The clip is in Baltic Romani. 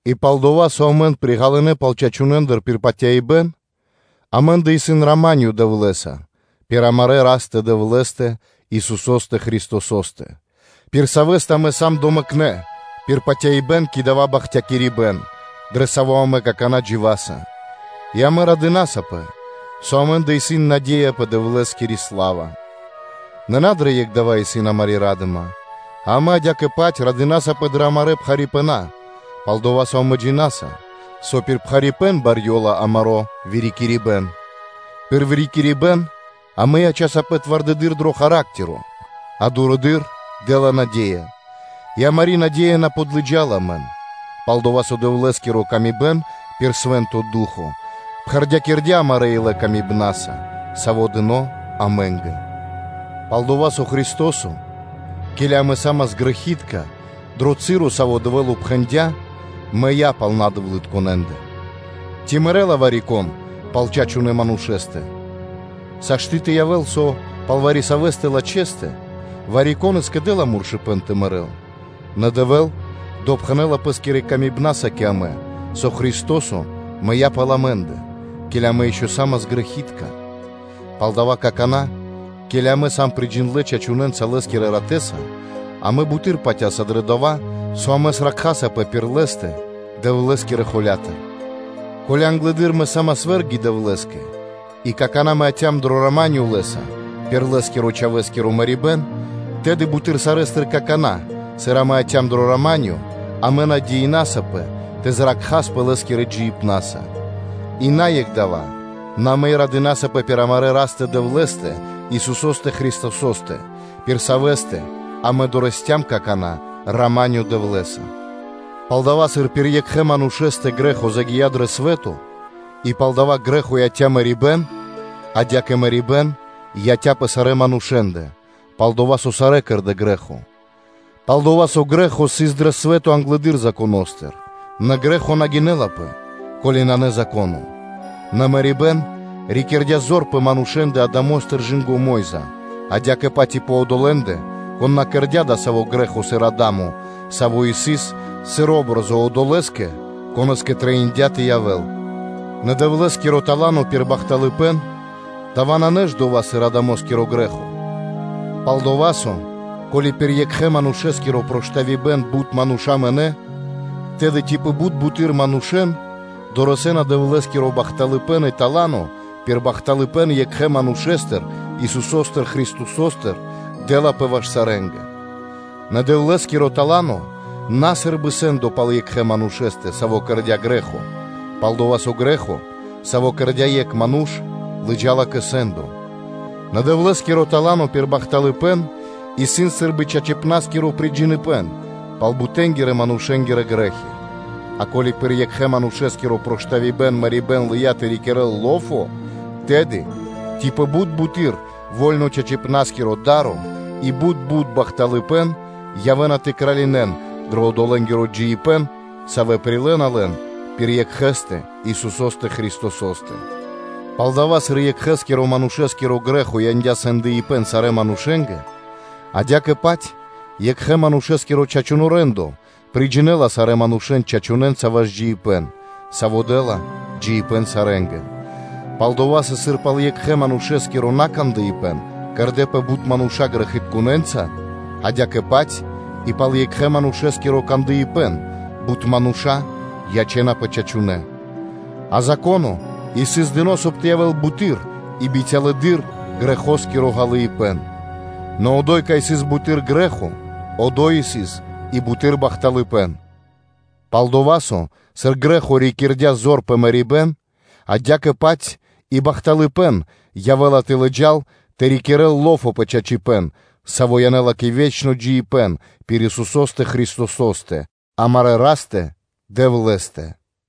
И пал-дова́ со амэн приґалынэ пал чачунэндэ пир патяибэ́н, амэ́ндэ исын рама́нё (миро) Дэвлэ́са пир амарэ́ Растэ-Дэвлэ́стэ, Исусо́стэ Христосо́стэ, пир Савэ́стэ амэ сам домэкнэ пир патяибэ́н кэ дава́ бахтякирибэ́н, дрэ саво́ амэ какана́ дживаса, и амэ радынасапэ, со амэ́ндэ исын наде́я пэ Дэвлэ́скири сла́ва. Нэ на дрэ екх дава́ исын амари́ ра́дыма, а амэ адя́кэ-паць радынасапэ дрэ амарэ́ пхарипэна, пал-дова́ со амэ джина́са, со пир пхарипэ́н барьёла амаро́ вырикирибэн. Пир вырикирибэн амэ ячасапэ твардэдыр дро характеро, а характеро дурэды́р дэ́ла наде́я. И амари́ наде́я на подлыджала амэн, пал-дова́ со Дэвлэ́скири ла́ска пир Свэ́нто Ду́хо (Фа́но) пхэрдякирдя́ амарэ́ илэ ласкаса, сави́ дыны́ амэ́нгэ: пал-дова́ со Христо́со, ке́ли амэ са́мас грэхи́тка, дро часо, Саво́ Дэвэ́л упхэндя, мыя́ пал надэвлытконэндэ. Ци мэрэ́ла вари-кон пал чачунэ́ манушэ́стэ? Сашты́ (могинэ́ла) тэ явэ́л, со пал вари-савэ́ лачхэстэ, вари-кон и скэдэ́ла муршыпэн тэ мэрэ́л, нэ Дэвэ́л допхэнэ́ла Пэ́скирэ ласкаса кэ амэ, со Христо́со мыя́ пал амэ́ндэ, ке́ли амэ ишчо (инкэ́) са́мас грэхи́тка. Палдава́ какана́, ке́ли амэ сам приджиндлэ чачунэнца Лэ́скирэ ратэ́са, амэ буты́р патя́са дрэ дова́, со амэ зракхасапэ пир Лэ́стэ Дэвлэ́скирэ холя́тыр. Ко́ли англэды́р амэ са́мас вэ́рги Дэвлэ́скэ и какана́ амэ яця́м дро рама́нё (миро) Лэ́са пир Лэ́скирэ Чхавэ́скиро мэрибэ́н, тэды буты́р сарэ́стыр какана́, сыр амэ яця́м дро рама́нё, амэ надеинасапэ тэ зракхаспэ Лэ́скирэ джиибнаса. И на екх дава́, нэ амэ и радынасапэ пир амарэ́ Растэ-Дэвлэ́стэ, Исусо́стэ Христосо́стэ, пир Савэ́стэ амэ дорэсцям (долыям) какана́ рама́нё Дэвлэ́са. Палдава́, сыр пир екхэ манушэ́стэ грэ́хо загия́ дро свэ́то, и пал дава́ грэ́хо яця́ мэрибэ́н, адя́кэ мэрибэ́н яця́ пэ сарэ́ манушэ́ндэ, пал-дова́ со сарэ́ кэрдэ́ грэ́хо: пал-дова́ со грэ́хо сыс дро свэ́то англэды́р Законо́стыр, нэ грэ́хо на гинэлапэ, ко́ли нанэ Зако́но; нэ мэрибэ́н рикирдя зор пэ манушэ́ндэ Адамостыр кэ Мо́йза, адя́кэ-паць и пэ одолэ́ндэ, кон на кэрдя́ дасаво грэ́хо, сыр Адамо, саво́ сыс, сыр о́бразо Одолэ́скэ, Конэ́скэ трэиндя́ тэ явэ́л. Нэ Дэвлэ́скиро тала́но пир бахталыпэ́н, дава́ нанэ ж дова́-паць, сыр Адамоскиро грэ́хо? Пал-дова́ со, ко́ли пир екхэ-манушэ́скиро проштавибэн бут мануша́ мынэ́, тэды ци пэ бут буты́р мануша́ дорэсэ́на Дэвлэ́скиро бахталыпэ́н и тала́но пир бахталыпэ́н екхэ Манушэ́стыр Исусо́стыр Христосостыр дэ́лапэ ваш сарэ́нгэ. Нэ Дэвлэ́скиро тала́но исын на сы́рбы сэ́ндо пал екхэ манушэ́стэ, саво́ кэрдя́ грэ́хо; пал-дова́ со грэ́хо, саво́ кэрдя́ екх ману́ш, лыджа́ла кэ сэ́ндо, нэ Дэвлэ́скиро тала́но пир бахталыпэ́н исын сы́рбы чачипна́скиро приджиныбэн пал бутэ́нгирэ-манушэ́нгирэ грэ́хи? А ко́ли пир екхэ́-манушэ́скиро проштавибэн мэрибэ́н лыя́ тэ рикирэ́л лофо (зор), тэды ци пэ бут бутэды́р во́льно чачипна́скиро да́ро и бут бут бахталыпэ́н явэ́на тэ кралинэн дро одолэнгиро джиибэ́н, савэ́ прилэ́на лэн пир Екхэ́стэ Исусо́стэ Христосо́стэ: палдава́, сыр екхэскиро манушэ́скиро грэ́хо яндя́ сэ́ндо сарэ́ манушэ́нгэ, адя́кэ-паць екхэ Манушэ́скиро чачуно́ рэ́ндо приджинэла сарэ́ манушэ́н чачунэнца ваш джиибэ́н, саво́ дэ́ла джиибэ́н сарэ́нгэ. Пал-дова́ со, сыр пал екхэ манушэ́скиро накандыпэн кэрдэ́пэ бут мануша́ грэхитконэнца, адя́кэ-паць и пал Екхэ Манушэ́скиро кандыпэн бут мануша́ ячэ́напэ чачунэнца. А Зако́но сыс дыно́, соб (кай) тэ явэ́л буты́р и бицялэдыр грэхоскиро ґалыибэ́н; нэ одо́й, кай сыс буты́р грэ́хо, одо́й сыс и буты́р бахталыпэ́н; пал-дова́ со, сыр грэ́хо рикирдя зор пэ мэрибэ́н, адя́кэ-паць и бахталыпэ́н явэ́ла тэ лыджа́л тэ рикирэ́л ло́фо (зор) пэ чачипэ́н, саво́ янэ́ла кэ ве́чно джиибэ́н пир Исусо́стэ Христосо́стэ, амарэ́ Растэ-Дэвлэ́стэ.